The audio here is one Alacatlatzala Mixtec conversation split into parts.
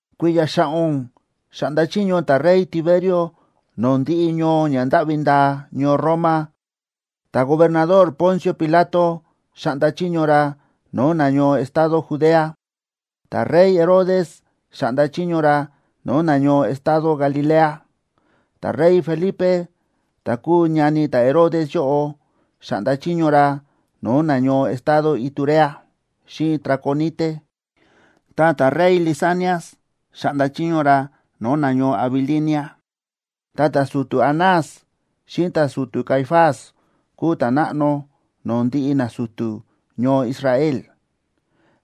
Kui̱ya̱ xa̱ꞌo̱n xáꞌnda chiño ta̱rey Tiberio no̱o̱ ndiꞌi ñoo ña ndáꞌvi ndaa ñoo Roma, ta̱gobernador Poncio Pilato xáꞌnda chiño ra no̱o̱ nañoo estado Judea, ta̱rey Herodes xáꞌnda chiño ra no̱o̱ nañoo estado Galilea, ta̱rey Felipe, ta kúu ñani ta̱Herodes yóꞌo, xáꞌnda chiño ra no̱o̱ nañoo estado Iturea xíꞌin Traconite, ta ta̱rey Lisanias xáꞌnda chiño ra no̱o̱ nañoo Abilinia. Ta ta̱su̱tu̱ Anás xíꞌin ta̱su̱tu̱ Caifás kúu ta̱náꞌno no̱o̱ ndiꞌi nasu̱tu̱ ñoo Israel.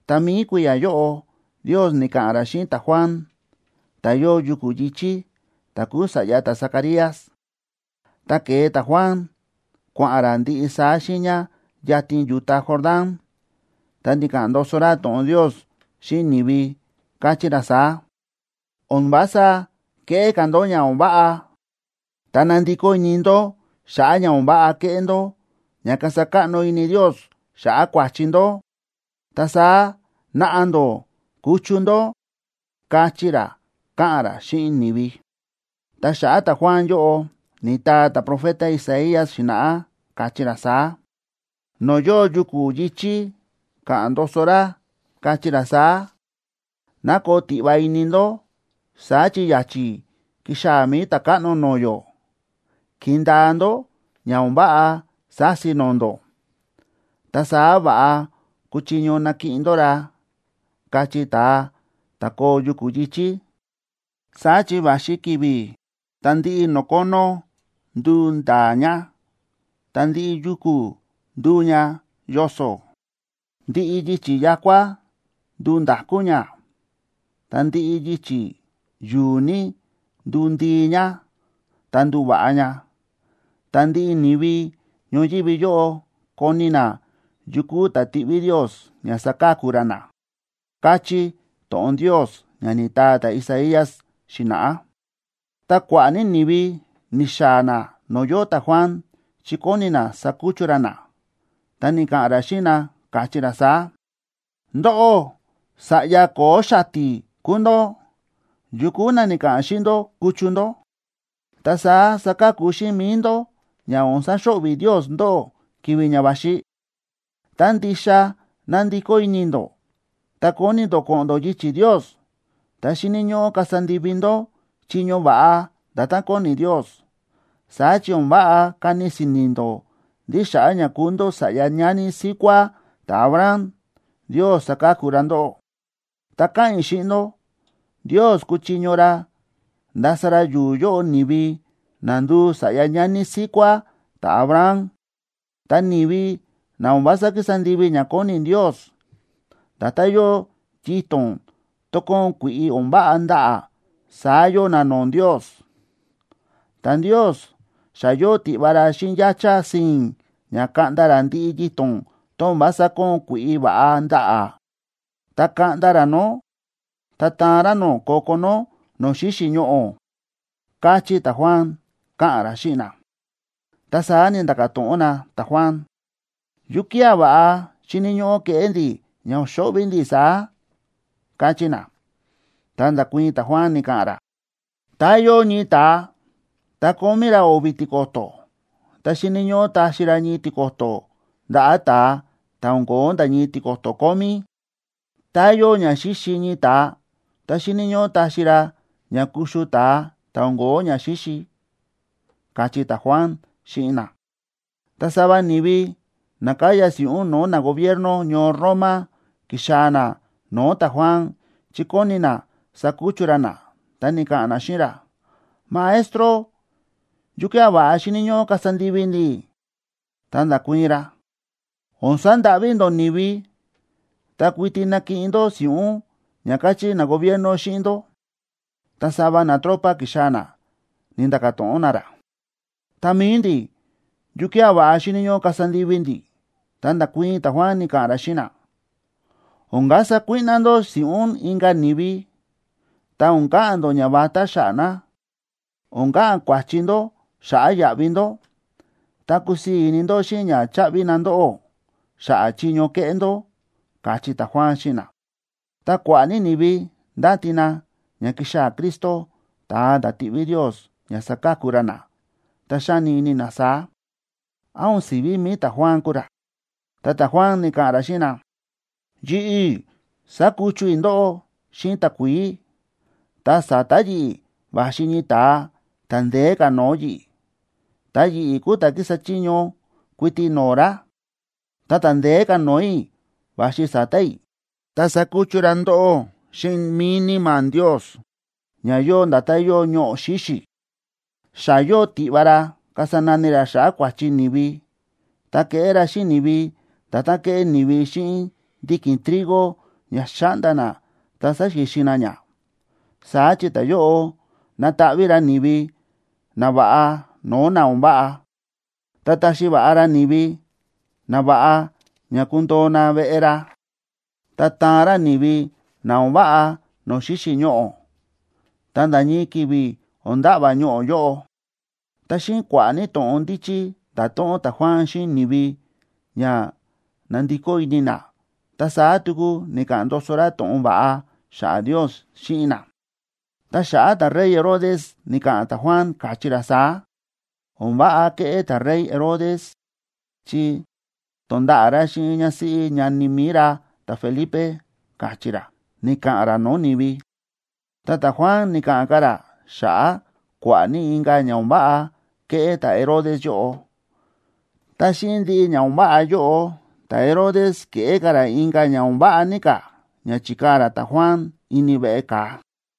Ta mi̱i kui̱ya̱ yóꞌo Ndios ni̱ka̱ꞌa̱n ra xíꞌin ta̱Juan, ta̱ yóo yuku̱ yi̱chí, ta̱ kúu sa̱ꞌya ta̱Zacarías. Ta ke̱e ta̱Juan kua̱ꞌa̱n ra ndiꞌi saá xiiña yatin yu̱ta Jordán. Ta ni̱ka̱ꞌa̱n ndoso ra to̱ꞌon Ndios xíꞌin ni̱vi, káchí ra saá: ―O̱n vása keꞌé ka̱ ndó ña o̱n váꞌa, ta nandikó ini ndó xa̱ꞌa̱ ña o̱n váꞌa ke̱ꞌé ndó ña kasa káꞌno ini Ndios xa̱ꞌa̱ kua̱chi ndó, ta saá naꞌa ndó kuchu ndó ―káchí ra, káꞌa̱n ra xíꞌin ni̱vi. Ta xa̱ꞌa̱ ta̱Juan yóꞌo ni̱taa ta̱profeta Isaías xi̱na̱ꞌá, káchí ra saá: No̱o̱ yóo yuku̱ yi̱chí ka̱ꞌa̱n ndoso ra, kachí ra saá: “Ná koo tiꞌva ini ndó, saá chi ya̱chi̱ kixaa̱ mi̱i Ta̱káꞌno no̱o̱ yó. Kindaa ndó ña o̱n váꞌa sási no̱o̱ ndó, ta saá va̱ꞌa kuchiño nakiꞌin ndó ra”, kachí ta̱a ta̱ koo yuku̱ yi̱chí. “Saá chi va̱xi ki̱vi̱ tá ndiꞌi no̱o̱ kónó nduu ndaa ña, ta ndiꞌi yuku̱ nduu ña yoso̱. Ndiꞌi yichi̱ ya̱kua nduu nda̱kú ña, ta ndiꞌi yichi̱ yu̱u̱ ní, nduu ndii ña, ta nduva̱ꞌa ña. Ta ndiꞌi ni̱vi ñoyívi yóꞌo koni na yu kúu ta̱ tiꞌví Ndios ña saka̱ku ra na”, káchí to̱ꞌon Ndios ña ni̱taa ta̱Isaías xi̱na̱ꞌá. Ta kua̱ꞌa̱ ní ni̱vi ni̱xaa̱ na no̱o̱ yóo ta̱Juan, chi kóni na sakuchu ra na, ta ni̱ka̱ꞌa̱n ra xíꞌin na, káchí ra saá: ―¡Ndóꞌó, sa̱ꞌya ko̱o̱ xati̱ kúu ndó! ¿Yu kúu na ni̱ka̱ꞌa̱n xíꞌin ndó kuchu ndó, ta saá saka̱ku xíꞌin mi̱i ndó ña o̱n saxo̱ꞌvi̱ Ndios ndóꞌó ki̱vi̱ ña va̱xi? Tá ndixa na̱ndikó ini ndó ta kóni ndó ko̱ꞌo̱n ndó yichi̱ Ndios, ta xíni̱ ñóꞌó kasa ndivi ndó chiño va̱ꞌa nda̱tán kóni Ndios. Saá chi o̱n váꞌa kani si̱ni̱ ndó ndí xa̱ꞌa̱ ña kúu ndó sa̱ꞌya ñani síkuá ta̱Abraham, Ndios saka̱ku ra ndóꞌó. Ta káꞌa̱n i̱ xíꞌin ndó, Ndios kúchiño ra ndasa ra yu̱u̱ yóꞌo ni̱vi na nduu sa̱ꞌya ñani síkuá ta̱Abraham. Ta ni̱vi na o̱n vása kísa ndivi ña kóni Ndios, nda̱tán yóo yito̱n tón kóon kui̱ꞌi o̱n váꞌa ndaꞌa̱, saá yóo na no̱o̱ Ndios. Ta Ndios xa yóo tiꞌva ra xíꞌin yáchá si̱i̱n ña kaꞌnda ra ndiꞌi yito̱n tón o̱n vása kóon kui̱ꞌi va̱ꞌa ndaꞌa̱, ta kaꞌnda ra nó, ta taan ra nó ko̱ko̱ nó no̱o̱ xíxi̱ ñoꞌo̱ ―káchí ta̱Juan, káꞌa̱n ra xíꞌin na. Ta saá ni̱nda̱ka̱ to̱ꞌon na ta̱Juan: ―¿Yukía̱ va̱ꞌa xíni̱ ñóꞌó keꞌé ndi̱ ña o̱n xo̱ꞌvi̱ ndi̱ saá? ―káchí na. Ta nda̱kuii̱n ta̱Juan, ni̱ka̱ꞌa̱n ra: ―Tá yóo ñii ta̱a, ta kómí ra o̱vi̱ tiko̱to̱, ta xíni̱ ñóꞌó taxi ra ñii tiko̱to̱ ndaꞌa̱ ta̱a ta̱ o̱n ko̱ó nda̱ ñii tiko̱to̱ kómí. Tá yóo ña xíxi ñii ta̱a, ta xíni̱ ñóꞌó taxi ra ña kuxu ta̱a ta̱ o̱n ko̱ó ñaxíxi ―káchí ta̱Juan xíꞌin na. Ta sava ni̱vi na káya si̱ꞌún no̱o̱ nagobierno ñoo Roma ki̱xaa̱ na no̱o̱ ta̱Juan chi kóni na sakuchu ra na, ta ni̱ka̱ꞌa̱n na xíꞌin ra: ―Maestro, ¿yukía̱ va̱ꞌa xíni̱ ñóꞌó kasa ndivi ndi̱? Ta nda̱kuii̱n ra: ―O̱n sandáꞌví ndó ni̱vi, ta kuiti nakiꞌin ndó si̱ꞌún ña káchí nagobierno xíꞌin ndó. Ta sava natropa ki̱xaa̱ na ni̱nda̱ka̱ to̱ꞌon na ra: ―Ta mi̱i ndi̱, ¿yukía̱ va̱ꞌa xíni̱ ñóꞌó kasa ndivi ndi̱? Ta nda̱kuii̱n ta̱Juan, ni̱ka̱ꞌa̱n ra xíꞌin na: ―O̱n kasa kuíꞌná ndó si̱ꞌún inka̱ ni̱vi, ta o̱n ka̱ꞌa̱n ndó ñavatá xa̱ꞌa̱ na. O̱n ka̱ꞌa̱n kuáchí ndó xa̱ꞌa̱ yaꞌvi ndó, ta kusii̱ ní ini ndó xíꞌin ña cháꞌvi na ndóꞌó xa̱ꞌa̱ chiño kéꞌé ndó ―káchí ta̱Juan xíꞌin na. Ta kua̱ꞌa̱ ní ni̱vi ndáti na ña kixaa̱ Cristo, ta̱a ta̱ tiꞌví Ndios ña saka̱ku ra na, ta xáni ini na saá: “¿Án o̱n si̱ví mi̱i ta̱Juan kúu ra?” Ta ta̱Juan ni̱ka̱ꞌa̱n ra xíꞌin na: ―Yi̱ꞌi̱ sákuchu i̱ ndóꞌó xíꞌin takuií, ta sa̱ta̱ yi̱ꞌi̱ va̱xi ñii ta̱a ta̱ ndeé ka̱ no̱o̱ yi̱ꞌi̱. Ta yi̱ꞌi̱ kúu ta̱ kísa chiño kuiti no̱o̱ ra. Ta ta̱ ndeé ka̱ no̱o̱ i̱ va̱xi sa̱ta̱ i̱, ta sakuchu ra ndóꞌó xíꞌin mi̱i Níma̱ Ndios, ña yóo nda̱tán yóo ñoꞌo̱ xíxi̱. Xa yóo tiꞌva ra kasa nani ra xa̱ꞌa̱ kua̱chi ni̱vi, ta keꞌé ra xíꞌin ni̱vi nda̱tán kéꞌé ni̱vi xíꞌin ndiki̱n trigo ña xa̱ꞌnda na ta sa̱xixin na ña. Saá chi ta̱yóꞌo nataꞌví ra ni̱vi nava̱ꞌa no̱o̱ na o̱n váꞌa. Ta taxi va̱ꞌa ra ni̱vi nava̱ꞌa ña kundoo na veꞌe ra, ta taan ra ni̱vi na o̱n váꞌa no̱o̱ xíxi̱ ñoꞌo̱, ta nda̱ ñii ki̱vi̱ o̱n nda̱ꞌva̱ ñoꞌo̱ yóꞌo. Ta xíꞌin kua̱ꞌa̱ ní to̱ꞌon ndíchí, nda̱to̱ꞌon ta̱Juan xíꞌin ni̱vi ña nandikó ini na, ta saá tuku ni̱ka̱ꞌa̱n ndoso ra to̱ꞌon va̱ꞌa xa̱ꞌa̱ Ndios xíꞌin na. Ta xa̱ꞌa̱ ta̱rey Herodes, ni̱ka̱ꞌa̱n ta̱Juan, káchí ra saá: “O̱n váꞌa ke̱ꞌé ta̱rey Herodes, chi to̱nda̱ꞌa̱ ra xíꞌin ñásíꞌí ñani mi̱i ra ta̱Felipe”, káchí ra, ni̱ka̱ꞌa̱n ra no̱o̱ ni̱vi. Ta ta̱Juan ni̱ka̱ꞌa̱n ka̱ ra xa̱ꞌa̱ kua̱ꞌa̱ ní inka̱ ña o̱n váꞌa ke̱ꞌé ta̱Herodes yóꞌo. Ta xíꞌin ndiꞌi ña o̱n váꞌa yóꞌo, ta̱Herodes ke̱ꞌé ka̱ ra inka̱ ña o̱n váꞌa ní ka̱ ña chi̱kaa̱ ra ta̱Juan ini veꞌe ka̱a.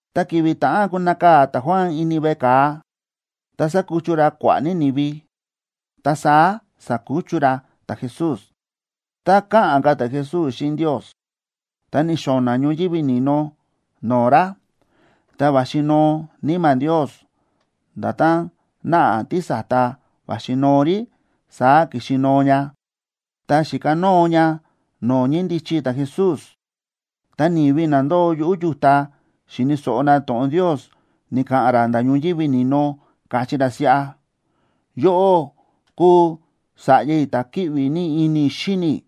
Ta ki̱vi̱ ta̱ꞌán kunakaa̱ ta̱Juan ini veꞌe ka̱a, ta sa̱kuchu ra kua̱ꞌa̱ ní ni̱vi. Ta saá sa̱kuchu ra ta̱Jesús. Tá káꞌa̱n ka̱ ta̱Jesús xíꞌin Ndios, ta ni̱xo̱na̱ ñoyívi ni̱no no̱o̱ ra, ta va̱xi noo Níma̱ Ndios. Nda̱tán náꞌa tísa̱ta va̱xi noo rí, saá ki̱xi noo ña, ta xi̱kanóo ña no̱o̱ ñíndichi ta̱Jesús. Ta ni̱vi na ndóo yuꞌu̱ yu̱ta xi̱ni̱ so̱ꞌo na to̱ꞌon Ndios ni̱ka̱ꞌa̱n ra nda̱ ñoyívi ni̱no, káchí ra siꞌa: ―Yóꞌó kúu Sa̱ꞌya i̱, ta̱ kíꞌvi ní ini i̱ xíni i̱,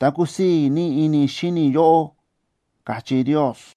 ta kúsii̱ ní ini i̱ xíni i̱ yóꞌó ―káchí Ndios.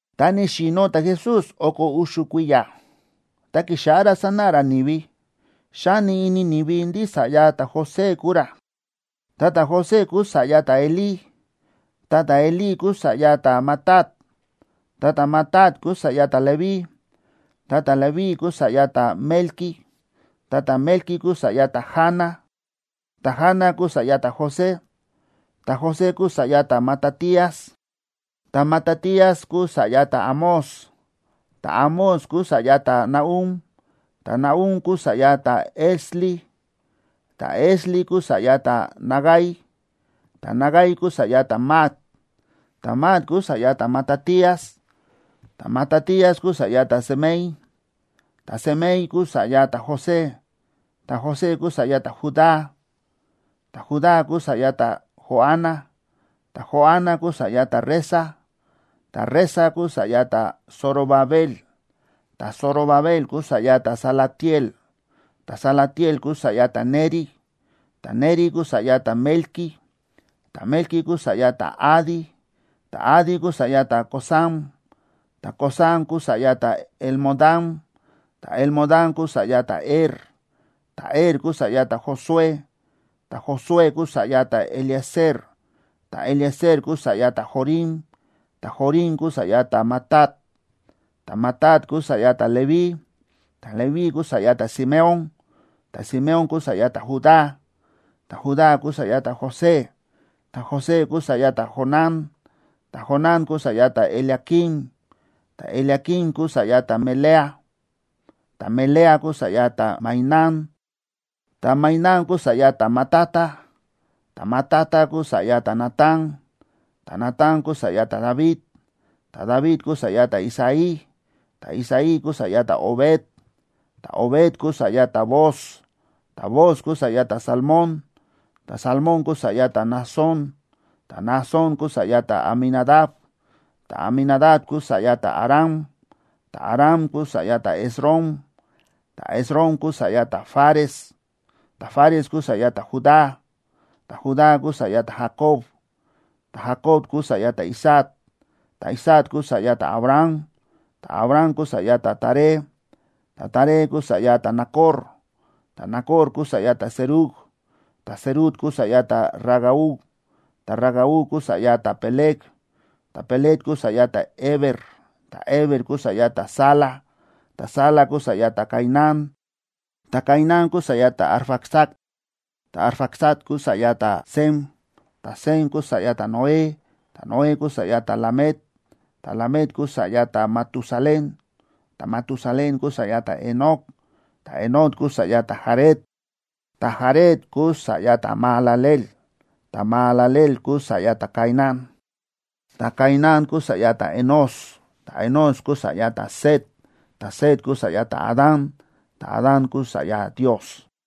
Tá ni̱xi̱no̱ ta̱Jesús o̱ko̱ u̱xu̱ kui̱ya̱, ta ki̱xáꞌá ra sánáꞌa ra ni̱vi. Xáni ini ni̱vi ndí sa̱ꞌya ta̱José kúu ra. Ta ta̱José kúu sa̱ꞌya ta̱Elí. Ta ta̱Elí kúu sa̱ꞌya ta̱Matat, ta ta̱Matat kúu sa̱ꞌya ta̱Leví, ta ta̱Leví kúu sa̱ꞌya ta̱Melqui, ta ta̱Melqui kúu sa̱ꞌya ta̱Jana, ta̱Jana kúu sa̱ꞌya ta̱José. Ta̱José kúu sa̱ꞌya ta̱Matatías, ta̱Matatías kúu sa̱ꞌya ta̱Amós, ta̱Amós kúu sa̱ꞌya ta̱Nahum, ta̱Nahum kúu sa̱ꞌya ta̱Esli, ta̱Esli kúu sa̱ꞌya ta̱Nagai. Ta̱Nagai kúu sa̱ꞌya ta̱Maat, ta̱Maat kúu sa̱ꞌya ta̱Matatías, ta̱Matatías kúu sa̱ꞌya ta̱Semei, ta̱Semei kúu sa̱ꞌya ta̱José, ta̱José kúu sa̱ꞌya ta̱Judá. Ta̱Judá kúu sa̱ꞌya ta̱Joana, ta̱Joana kúu sa̱ꞌya ta̱Resa, ta̱Resa kúu sa̱ꞌya ta̱Zorobabel, ta̱Zorobabel kúu sa̱ꞌya ta̱Salatiel, ta̱Salatiel kúu sa̱ꞌya ta̱Neri. Ta̱Neri kúu sa̱ꞌya ta̱Melqui, ta̱Melqui kúu sa̱ꞌya ta̱Adi, ta̱Adi kúu sa̱ꞌya ta̱Cosam, ta̱Cosam kúu sa̱ꞌya ta̱Elmodam, ta̱Elmodam kúu sa̱ꞌya ta̱Er. Ta̱Er kúu sa̱ꞌya ta̱Josué, ta̱Josué kúu sa̱ꞌya ta̱Eliezer, ta̱Eliezer kúu sa̱ꞌya ta̱Jorim, ta̱Jorim kúu sa̱ꞌya ta̱Matat, ta̱Matat kúu sa̱ꞌya ta̱Leví. Ta̱Leví kúu sa̱ꞌya ta̱Simeón, ta̱Simeón kúu sa̱ꞌya ta̱Judá, ta̱Judá kúu sa̱ꞌya ta̱José, ta̱José kúu sa̱ꞌya ta̱Jonán, ta̱Jonán kúu sa̱ꞌya ta̱Eliaquim. Ta̱Eliaquim kúu sa̱ꞌya ta̱Melea, ta̱Melea kúu sa̱ꞌya ta̱Mainán, ta̱Mainán kúu sa̱ꞌya ta̱Matata, ta̱Matata kúu sa̱ꞌya ta̱Natán. Ta̱Natán kúu sa̱ꞌya ta̱David, ta̱David kúu sa̱ꞌya ta̱Isaí, ta̱Isaí kúu sa̱ꞌya ta̱Obed, ta̱Obed kúu sa̱ꞌya ta̱Booz, ta̱Booz kúu sa̱ꞌya ta̱Salmón, ta̱Salmón kúu sa̱ꞌya ta̱Naasón. Ta̱Naasón kúu sa̱ꞌya ta̱Aminadab, ta̱Aminadab kúu sa̱ꞌya ta̱Aram, ta̱Aram kúu sa̱ꞌya ta̱Esrom, ta̱Esrom kúu sa̱ꞌya ta̱Fares, ta̱Fares kúu sa̱ꞌya ta̱Judá. Ta̱Judá kúu sa̱ꞌya ta̱Jacob, ta̱Jacob kúu sa̱ꞌya ta̱Isaac, ta̱Isaac kúu sa̱ꞌya ta̱Abraham, ta̱Abraham kúu sa̱ꞌya ta̱Taré, ta̱Taré kúu sa̱ꞌya ta̱Nacor. Ta̱Nacor kúu sa̱ꞌya ta̱Serug, ta̱Serug kúu sa̱ꞌya ta̱Ragau, ta̱Ragau kúu sa̱ꞌya ta̱Peleg, ta̱Peleg kúu sa̱ꞌya ta̱Heber, ta̱Heber kúu sa̱ꞌya ta̱Sala. Ta̱Sala kúu sa̱ꞌya ta̱Cainán, ta̱Cainán kúu sa̱ꞌya ta̱Arfaxad, ta̱Arfaxad kúu sa̱ꞌya ta̱Sem, ta̱Sem kúu sa̱ꞌya ta̱Noé, ta̱Noé kúu sa̱ꞌya ta̱Lamec. Ta̱Lamec kúu sa̱ꞌya ta̱Matusalén, ta̱Matusalén kúu sa̱ꞌya ta̱Enoc, ta̱Enoc kúu sa̱ꞌya ta̱Jared, ta̱Jared kúu sa̱ꞌya ta̱Mahalaleel, ta̱Mahalaleel kúu sa̱ꞌya ta̱Cainán. Ta̱Cainán kúu sa̱ꞌya ta̱Enós, ta̱Enós kúu sa̱ꞌya ta̱Set, ta̱Set kúu sa̱ꞌya ta̱Adán, ta̱Adán kúu sa̱ꞌya Ndios.